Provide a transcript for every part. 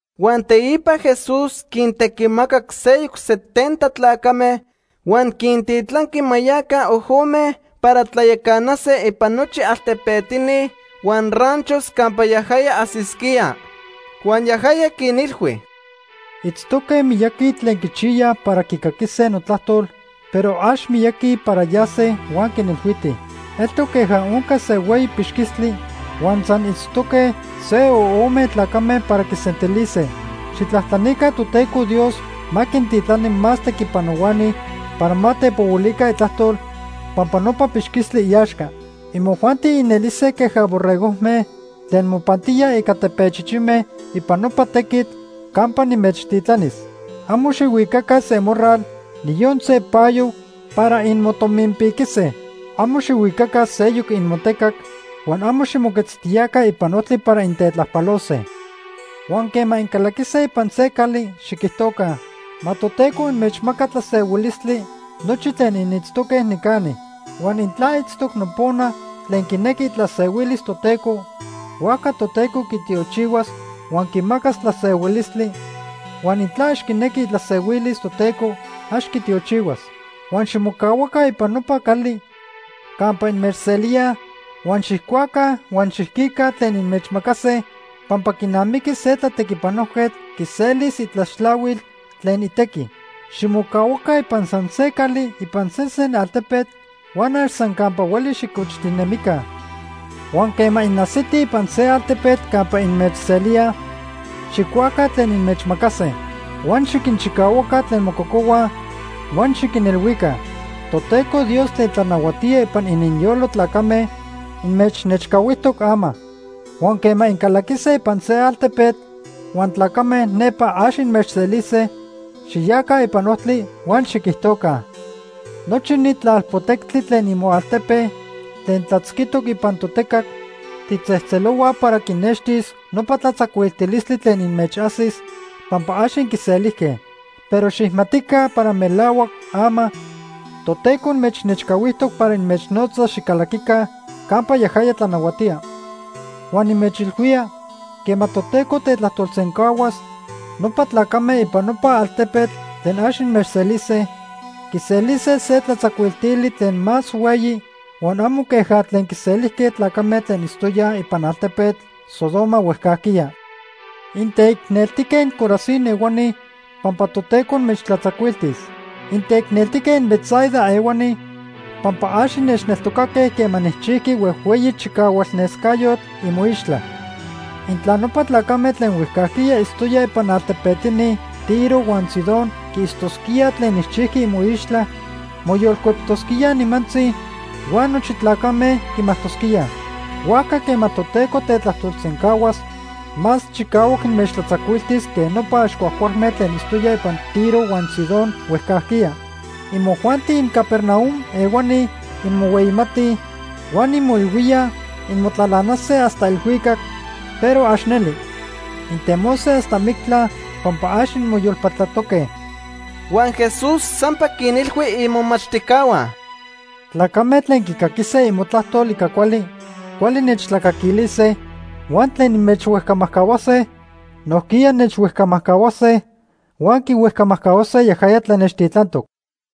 Huan teipa Jesús quintequimacac seyoc setenta tlacame huan quintitlanqui ma yaca ojome para tlayacanase ipan nochi altepetini huan ranchos campa yajaya ajsisquía. Huan yajaya quinilhui: “Itztoque miyaqui tlen quichiyaj para quicaquise notlajtol, pero ax miyaqui para yase huan quinilhuitij. Eltoc queja onca se hueyi pixquistli huan san itztoque se o ome tlacame para quisentilise. Xijtlajtlanica Toteco Dios ma quintitlani más tequipanohuani para ma tepohuilica itlajtol pampa nopa pixquistli iaxca. Imojuanti inelise queja borregojme tlen mopantíaj ica tepechichime ipan nopa tequitl campa nimechtitlanis. Amo xijhuicaca se morral, niyon se payo para inmotominpiquise. Amo xijhuicaca seyoc inmotecac huan amo ximoquetztiyaca ipan ojtli para intetlajpalose. Huan quema incalaquise ipan se cali, xiquijtoca: ‘Ma Toteco inmechmaca tlasehuilistli nochi tlen initztoque nicani.’ Huan intla itztoc nopona tlen quinequi itlasehuilis Toteco, huajca Toteco quitiochihuas huan quimacas tlasehuilistli, huan intla ax quinequi itlasehuilis Toteco ax quitiochihuas. Huan ximocahuaca ipan nopa cali campa inmechselíaj, huan xijcuaca huan xiquica tlen inmechmacase pampa quinamiqui se tlatequipanojquetl quiselis itlaxtlahuil tlen itequi. Ximocahuaca ipan san se cali ipan sesen altepetl, huan ax san campa hueli xicochtinemica. Huan quema inajsitij ipan se altepetl campa inmechselíaj, xijcuaca tlen inmechmacase. Huan xiquinchicahuaca tlen mococohuaj huan xiquinilhuica: ‘Toteco Dios tlen tlanahuatía ipan ininyolo tlacame inmechnechcahuijtoc ama.’ Huan quema incalaquise ipan se altepetl huan tlacame nepa ax inmechselise, xiyaca ipan ojtli huan xiquijtoca: ‘Nochi ni tlalpotectli tlen imoaltepe tlen tlatzquijtoc ipan totecac tijtzejtzelohuaj para quinextis nopa tlatzacuiltilistli tlen inmechajsis pampa ax inquiselijque. Pero xijmatica para melahuac ama Toteco inmechnechcahuijtoc para inmechnotzas xicalaquica campa yajaya tlanahuatía.’ Huan nimechilhuía, quema Toteco tetajtolsencahuas, nopa tlacame ipan nopa altepetl tlen ax inmechselise, quiselise se tlatzacuiltili tlen más hueyi huan amo queja tlen quiselijque tlacame tlen itztoyaj ipan altepetl Sodoma huejcajquiya. “Inteicneltijque inCorazín ehuani pampa Toteco inmechtlatzacuiltis. Inteicneltique inBetsaida ehuani, pampa ax innechneltocaque quema nijchijqui huejhueyi chicahual nescayotl imoixtla. Intla nopa tlacame tlen huejcajquiya itztoyaj ipan altepetini Tiro huan Sidón quiitztosquíaj tlen nijchijqui imoixtla, moyolcueptosquíaj nimantzi, huan nochi tlacame quimajtosquíaj. Huajca quema Toteco tetlajtolsencahuas, más chicahuac inmechtlatzacuiltis que nopa ax cuajcualme tlen itztoyaj ipan Tiro huan Sidón huejcajquiya. Imojuanti inCapernaum ehuani inmohueyimatij huan inmoilhuíaj inmotlalanase hasta elhuicac, pero ax neli. Intemose hasta mictla pampa ax inmoyolpatlatoque.” Huan Jesús sampa quinilhui imomachtijcahua: “Tlacame tlen quicaquise imotlajtol ica cuali, cuali nechtlacaquilise, huan tlen inmechhuejcamajcahuase, nojquiya nechhuejcamajcahuase huan quihuejcamajcahuase yajaya tlen nechtitlantoc.”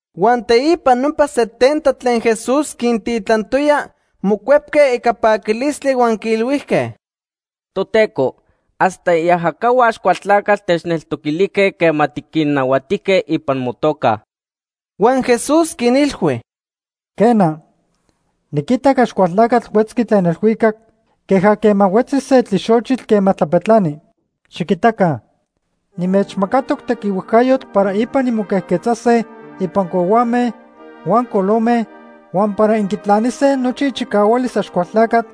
Huan teipa nopa setenta tlen Jesús quintitlantoya mocuepque ica paquilistli huan quiilhuijque: ―Toteco, hasta iajacahua Axcualtlacatl techneltoquilijque quema tiquinnahuatijque ipan motoca. Huan Jesús quinilhui: ―Quena, niquitac Axcualtlacatl huetzqui tlen elhuicac queja quema huetzi se tlixochitl quema tlapetlani. Xiquitaca, nimechmacatoc tequihuejcayotl para ipan inmoquejquetzase ipan cohuame huan colome, huan para inquitlanise nochi ichicahualis Axcualtlacatl,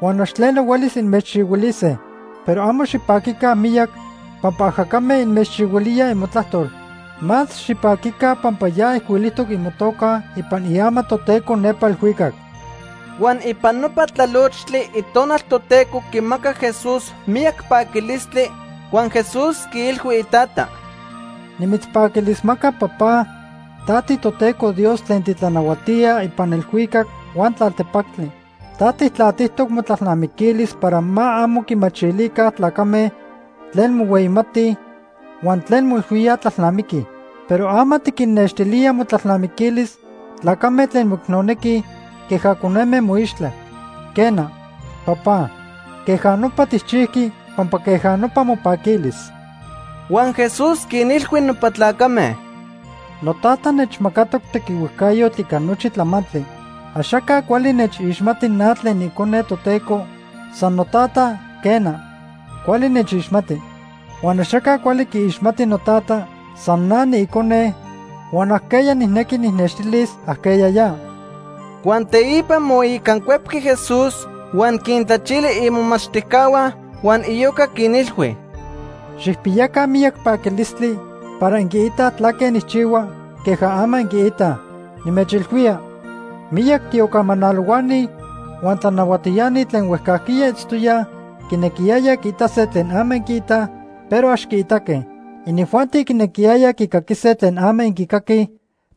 huan ax tleno huelis inmechchihuilise. Pero amo xipaquica miyac pampa ajacame inmechchihuilíaj imotlajtol. Más xipaquica pampa ya ijcuilijtoc imotoca ipan iama Toteco nepa elhuicac. Huan ipan nopa tlalochtli Itonal Toteco quimacac Jesús miyac paquilistli huan Jesús quiilhui ITata: “Nimitzpaquilismaca, Papá, ta tiToteco Dios tlen titlanahuatía ipan elhuicac huan tlaltepactli. Ta Tijtlatijtoc motlalnamiquilis para ma amo quimachilica tlacame tlen mohueyimatij huan tlen moilhuíaj tlalnamiquij. Pero ama tiquinnextilía motlalnamiquilis tlacame tlen moicnonequij queja coneme moixtla. Quena, Papá, queja nopa tijchijqui pampa queja nopa mopaquilis.” Huan Jesús quinilhui nopa tlacame: “Notata nechmacatoc tequihuejcayotl ica nochi tlamantli. Axaca cuali nechixmati na tlen niIcone Toteco, san Notata, quena, cuali nechixmati. Huan axaca cuali quiixmati noTata, san na niIcone huan ajqueya nijnequi nijnextilis ajqueya ya.” Huan teipa moicancuepqui Jesús huan quintlachili imomachtijcahua huan iyoca quinilhui: “Xijpiyaca miyac paquilistli para inquiitaj tlaque nijchihua queja ama inquiitaj. Nimechilhuía, miyac tiocamalohuani huan tlanahuatiani tlen huejcajquiya itztoyaj quinequiyaya quiitase tlen ama inquiitaj, pero ax quiitaque. Inijuanti quinequiyayaj quicaquise tlen ama inquicaquij,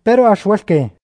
pero ax huelque.”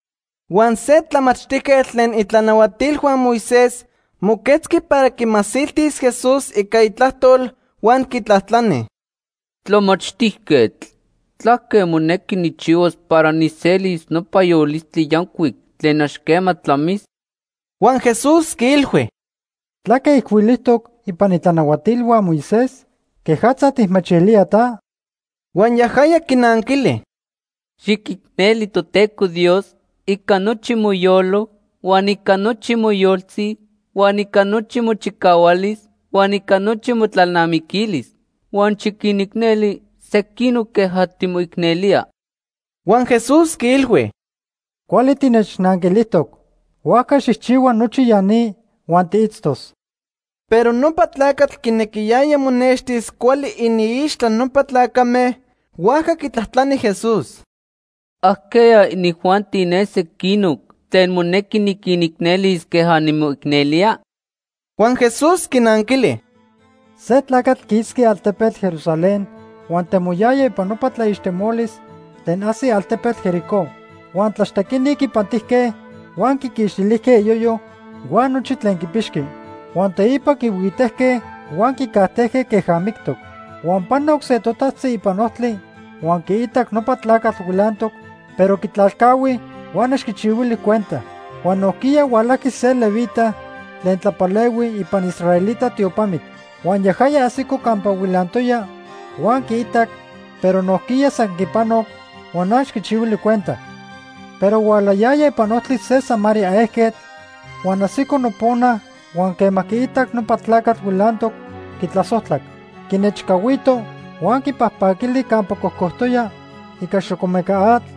Huan se tlamachtijquetl tlen itlanahualtilhua Moisés moquetzqui para quimasiltis Jesús ica itlajtol huan quitlajtlani: ―Tlamachtijquetl, ¿tlaque monequi nijchihuas para nijselis nopa yolistli yancuic tlen ax quema tlamis? Huan Jesús quiilhui: ―¿Tlaque ijcuilijtoc ipan itlanahuatilhua Moisés? ¿Quejatza tijmachilía ta? Huan yajaya quinanquili: ―Xiquicneli Toteco Dios ica nochi moyolo, huan ica nochi moyoltzi, huan ica nochi mochicahualis, huan ica nochi motlalnamiquilis. Huan xiquinicneli sequinoc queja timoicnelía. Huan Jesús quiilhui: ―Cuali tinechnanquilijtoc. Huajca xijchihua nochi ya ni huan tiitztos. Pero nopa tlacatl quinequiyaya monextis cuali iniixtla nopa tlacame, huajca quitlajtlani Jesús: ―¿Ajqueya inijuanti ne sequinoc tlen monequi niquinicnelis queja nimoicnelía? Huan Jesús quinanquili: ―Se tlacatl quisqui altepetl Jerusalén huan temoyaya ipan nopa tlaixtemolis tlen ajsi altepetl Jericó. Huan tlaxtequini quipantijque, huan quiquixtilijque iyoyo huan nochi tlen quipixqui. Huan teipa quihuitejque huan quicajtejque queja mictoc. Huan panoc se totajtzi ipan ojtli huan quiitac nopa tlacatl huilantoc, pero quitlalcahui huan ax quichihuili cuenta. Huan nojquiya hualajqui se levita tlen tlapalehui ipan israelita tiopamitl. Huan yajaya ajsico campa huilantoya huan quiitac, pero nojquiya san quipanoc huan ax quichihuili cuenta. Pero hualayaya ipan ojtli se Samaría ejquetl, huan ajsico nopona huan quema quiitac nopa tlacatl huilantoc, quitlasojtlac. Quinechcahuito huan quipajpaquili campa cocojtoya ica xocomeca atl,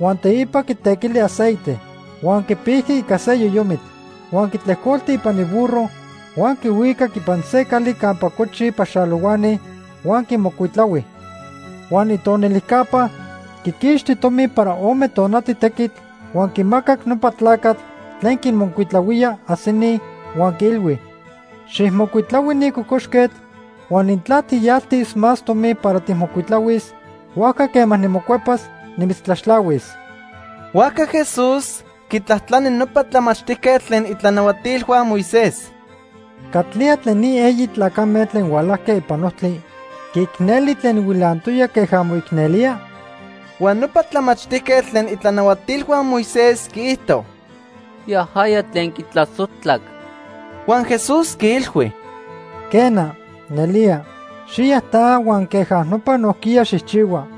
huan teipa quitequili aceite. Huan quipijqui ica se yoyomitl. Huan quitlejcolti ipan iburro huan quihuicac ipan se cali campa cochij paxalohuani huan quimocuitlahui. Huan itonilijcapa quiquixti tomi para ome tonati tequitl, huan quimacac nopa tlacatl tlen quinmocuitlahuía ajsini huan quiilhui: ‘Xijmocuitlahui ni cocoxquetl huan intla tijyaltis más tomi para tijmocuitlahuis, huajca quema nimocuepas, nimitztlaxtlahuis.’ Huajca Jesús quitlajtlani nopa tlamachtijquetl tlen itlanahuatilhua Moisés: ―¿Catlía tlen ni eyi tlacame tlen hualajque ipan ojtli quiicneli tlen huilantoya queja moicnelía? Huan nopa tlamachtijquetl tlen itlanahuatilhua Moisés quiijto: ―Yajaya tlen quitlasojtlac. Huan Jesús quiilhui: ―Quena, nelía. Xiya ta huan queja nopa nojquiya xijchihua.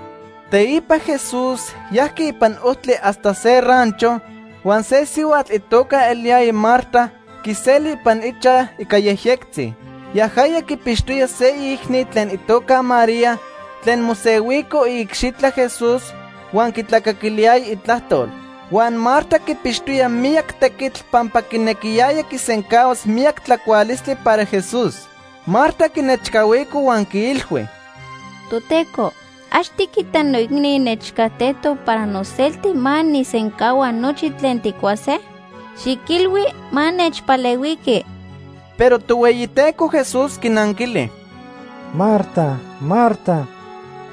Teipa Jesús yajqui ipan ojtli hasta se rancho, huan se sihuatl itoca eliyaya Marta quiseli ipan ichaj ica yejyectzi. Yajaya quipixtoya se iicni tlen itoca María tlen mosehuico iicxitla Jesús huan quitlacaquiliyaya itlajtol. Huan Marta quipixtoya miyac tequitl pampa quinequiyaya quisencahuas miyac tlacualistli para Jesús. Marta quinechcahuico huan quiilhui: ―Toteco, ¿ax tiquita noicni nechcajtejtoc para noselti ma nijsencahua nochi tlen tijcuase? Xiquilhui ma nechpalehuiqui. Pero Tohueyiteco Jesús quinanquili: ―Marta, Marta,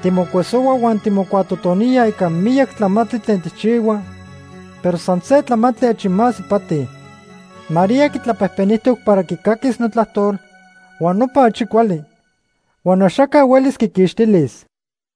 timocuesohua huan timocuatotonía ica miyac tlamantli tlen tijchihua, pero san se tlamantli achi más ipati. María quitlapejpenijtoc para quicaquis notlajtol, huan nopa achi cuali, huan axaca huelis quiquixtilis.